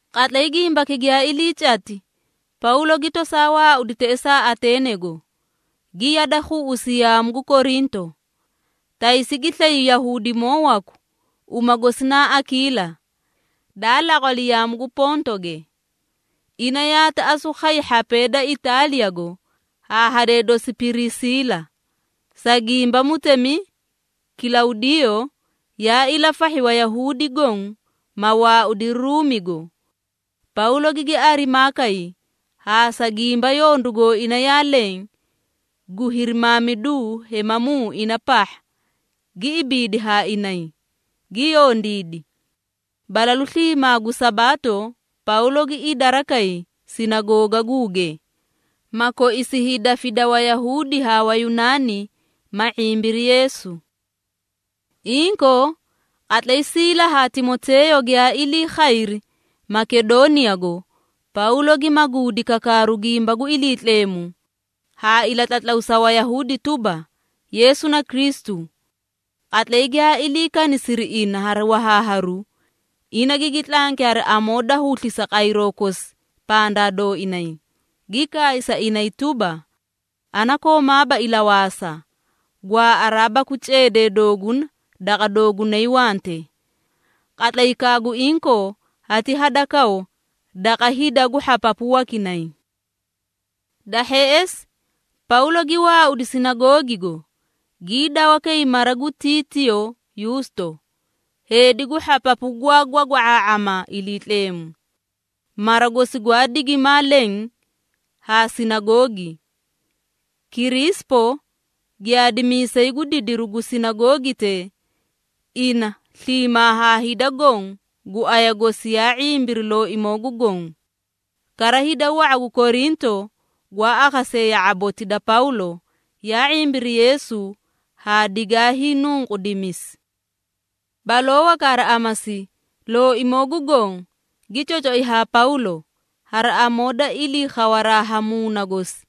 Qatlay gimbaki giyaa ilii cati, Pawlo gi tosaa waaudi teꞌesaa Ateenego, gi yade khuꞌusi yaamu gu Korinto. Taysi gi slay Yahuudimoo waku, uma gosi naa Akiila, daa laqwali yaamu gu Pontoge. Ina yaati asu khay hhapee da Itaaliyago haa hadee dosi Pirisiila, sa gimba mutemi Kilawdiyoo yaa ilafahhi Wayahuudi goõ, ma waaudiri Ruumigo. Pawlo gigi arimaa kay, haa sa gimba yondu gooina yaa leẽ gu hirimaamidu hemamuu ina pahha, gi ibiidi haa inay, gi yondiidi. Balalu sliimaa gu Sabaato Pawlo gi idara kay sinagoogaguuge, ma koisi hiidafida Wayahuudi haa Wayunaani, ma ⁄imbiri Yeesu. Inkoo, qatlay Siila haa Timoteeyo giyaa ilii khayri Makedooniyago, Pawlo gi maguudi kakaaru gu gimba gu Iliitleemu haa ilatlatlaw sa Wayahuudi tuba, Yeesu na Kristu. Qatlay giyaa ilii kanisiri ina hari wahaaharu, ina gigi tlanki hari amoo da huslisa qayroo kosi pandaa dooinay, gi kaay sa inay tuba, “Ana koomaaba ilawaasa, gwaaꞌaraa baku ceedee dooguna daqa doogunay wante. Qatlaykaa gu inkoo hati hadakaw daqa hida gu hhapapu wakinay.” Da hheꞌesi Pawlo gi waaudi sinagoogigo, gii dawa kay mara gu Titiiyo Yuusto, heedi gu hhapapu gwaa gwagwa⁄aa⁄ama Iliitleemu. Mara gosi gwaa digimaa leẽ haa sinagoogi. Kiriisipo, giyaadimiisay gu didiru gu sinagoogitee, ina sliimaa haa hida goõ gu aya gosi yaa ⁄imbiri Looimoo gu Goõ. Kara hida wa⁄a gu Korinto gwaa akhasee ya⁄aboti da Pawlo, yaa ⁄imbiri Yeesu haa digaa hiinunqudimisi. Baloo waka hari amasi, Looimoo gu Goõ gi cocoi haa Pawlo, hari amoo da ilii khawaraa ha Muuna gosi,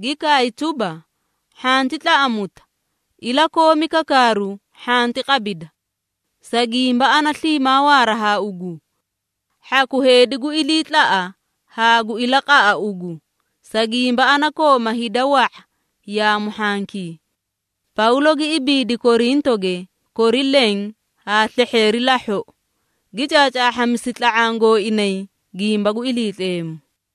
gi kaay tuba, “Hhanti tlaꞌamuta, ilakoomi kakaaru, hhanti qabida. Sa gimba ana sliimaa waara haa ugu, hhaku heedi gu iliitlaꞌa haa gu ilaqaꞌa ugu, sa gimba ana kooma hida wa⁄a yaamu hhankii.” Pawlo gi ibiidi Korintoge kori leẽ haa slehheeri lahhoꞌo, gi caacaahhamisi tla⁄aã gooinay gimba gu Iliitleemu.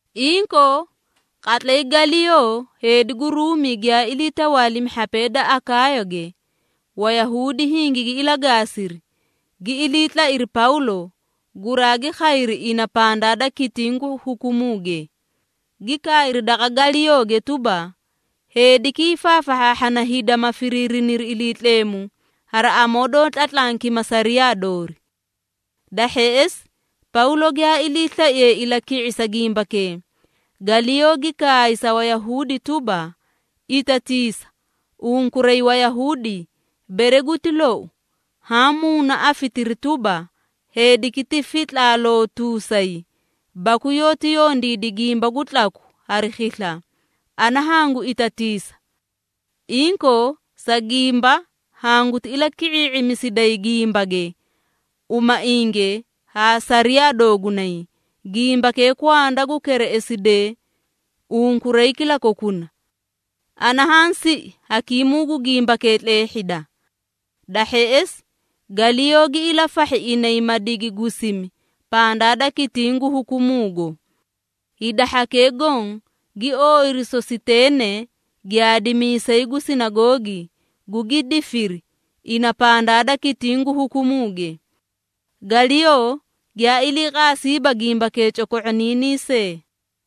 Inkoo, qatlay Galiyoo heedi gu Ruumi giyaa ilii tawaalimi hhapee da Akaayage, Wayahuudi hingigi ilagaasiri, gi ilii tlairi Pawlo, guraagi khayri ina pandaa da kitiĩ gu hukumuuge, gi kaayri daqa Galiyooge tuba, “Heediki, hiifaafahhaahhana hida, ma firiiriniri Iliitleemu hari amoo doó tlatlankima sariyaa doori.” Da hheꞌesi, Pawlo giyaa iliislaiye ilaki⁄isa gimbakee, Galiyoo gi kaay sa Wayahuudi tuba, “Itatiisa! Unkuray Wayahuudi, bere guti lou, haã muuna afitiri tuba, heediki ti fitlaalootuusay baku yoóti yondiidi gimba gu tlaku hari khisla, ana hangu itatiisa. Inkoo, sa gimba hanguti ilaki⁄ii⁄imisiday gimbage, umainge haa sariyaa doogunay, gimbakee kwanda gu kereꞌesidee unkuray kilakokuna. Ana haã siꞌi hakiimuu gu gimbakee tleehhida.” Da hheꞌesi Galiyoo gi ilafahhi inay ma digi gusimi pandaa da kitiĩ gu hukumuugo. Hida hhakee goõ gi ooyiri Sositeene, giyaadimiisay gu sinagoogi, gugi difiri ina pandaa da kitiĩ gu hukumuuge. Galiyoo giyaa iliiqaasiiba gimbakee coko⁄oniinii see.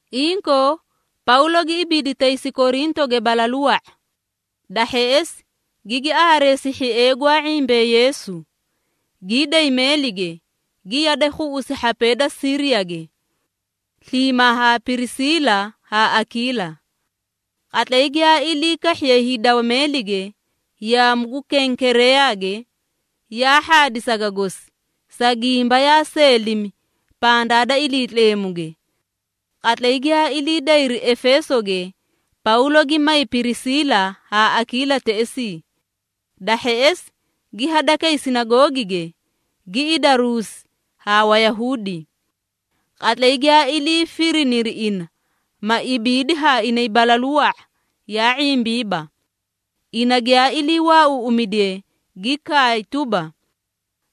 Inkoo, Pawlo gi ibiidi taysi Korintoge balalu wa⁄a. Da hheꞌesi gigi aareesi hhiee gwaa ⁄imbee Yeesu, gii day meelige, gi yade khuꞌusi hhapee da Siiriyage sliimaa ha Pirisiila haa Akiila. Qatlay giyaa ilii kahhiye hiidawa meelige, yaamu gu Kenkereeyage, yaa hhaadi saga gosi, sa gimba yaa seelimi pandaa da Iliitleemuge. Qatlay giyaa ilii dayri Efeesoge, Pawlo gi may Pirisiila haa Akiila teꞌesii. Da hheꞌesi, gi hadakay sinagoogige, gi idaruusi haa Wayahuudi. Qatlay giyaa ilii firiniri ina, ma ibiidi haa inay balalu wa⁄a, yaa ⁄imbiiba. Ina giyaa ilii waauuꞌumidiye, gi kaay tuba,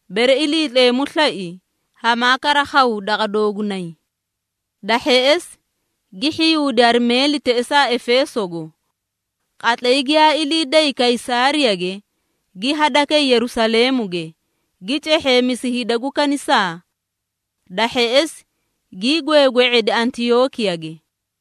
“Bere Iliitleemu slai hamaa kara khaw daqa doogunay.” Da hheꞌesi, gi hhiyuudi hari meeli teꞌesaa Efeesogo. Qatlay giyaa ilii day Kaysaariyage, gi hadakay Yerusaleemuge, gi cehheemisi hida gu kanisaa. Da hheꞌesi, gii gweegwe⁄edi Antiyookiyage.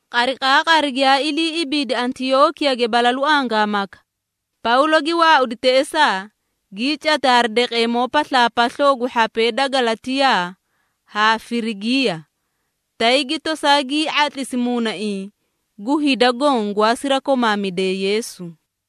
Qariqaaqari giyaa ilii ibiidi Antiyookiyage balalu angaamaka, Pawlo gi waaudi teꞌesaa, gii cati hari daqeemoo paslaapasloo gu hhapee da Galatiyaa haa Firigiiya, tay gi tosaa gii ⁄atlisi muunaiĩ gu hida goõ gwaa sirakomaamidee Yeesu.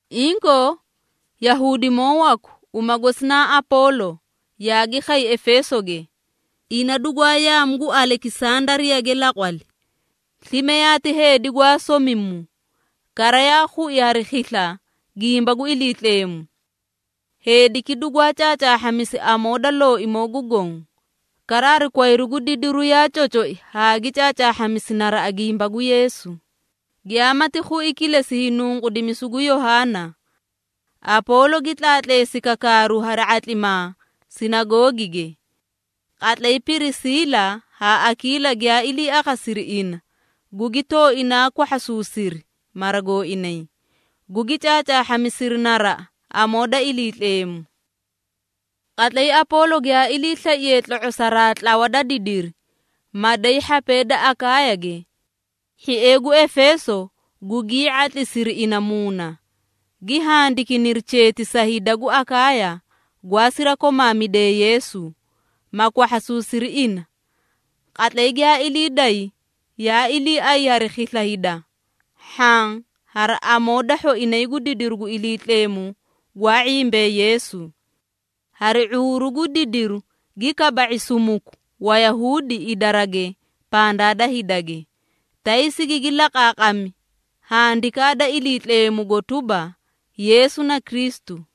Inkoo, Yahuudimoo waku, uma gosi naa Apoolo, yaagi khay Efeesoge. Ina dugwaa yaamu gu Alekisandariyage laqwali. Slime yaati heedi gwaa somimu, kara yaa khui hari khisla gimba gu Iliitleemu. Heediki dugwaa caacaahhamisi amoo da Looimoo gu Goõ, kara hari kwayru gu didiru yaa cocoi haa gi caacaahhamisi naraꞌa gimba gu Yeesu, giyaamati khui kilesi hiinunqudimisu gu Yohaana. Apoolo gi tlaatleesi kakaaru hari ⁄atlimaa sinagoogige. Qatlay Pirisiila haa Akiila giyaa ilii akhasiri ina, gugi tooinaa kwahhasuusiri mara gooinay, gugi caacaahhamisiri naraꞌa amoo da Iliitleemu. Qatlay Apoolo giyaa iliislaiye tlo⁄osaraa tlawa da didiri, ma day hhapee da Akaayage, hhiee gu Efeeso gugii ⁄atlisiri ina muuna, gi handikiniri cheeti sa hida gu Akaaya gwaa sirakomaamidee Yeesu, ma kwahhasuusiri ina. Qatlay giyaa ilii day, yaa iliiay hari khisla hida, hhaã hari amoo da hhoinay gu didiru gu Iliitleemu gwaa ⁄imbee Yeesu. Hari ⁄uuru gu didiru gi kaba⁄i sumuku Wayahuudi idarage pandaa da hidage, tay sigigi laqaaqami Handikaa da Iliitleemugo tuba, Yeesu na Kristu.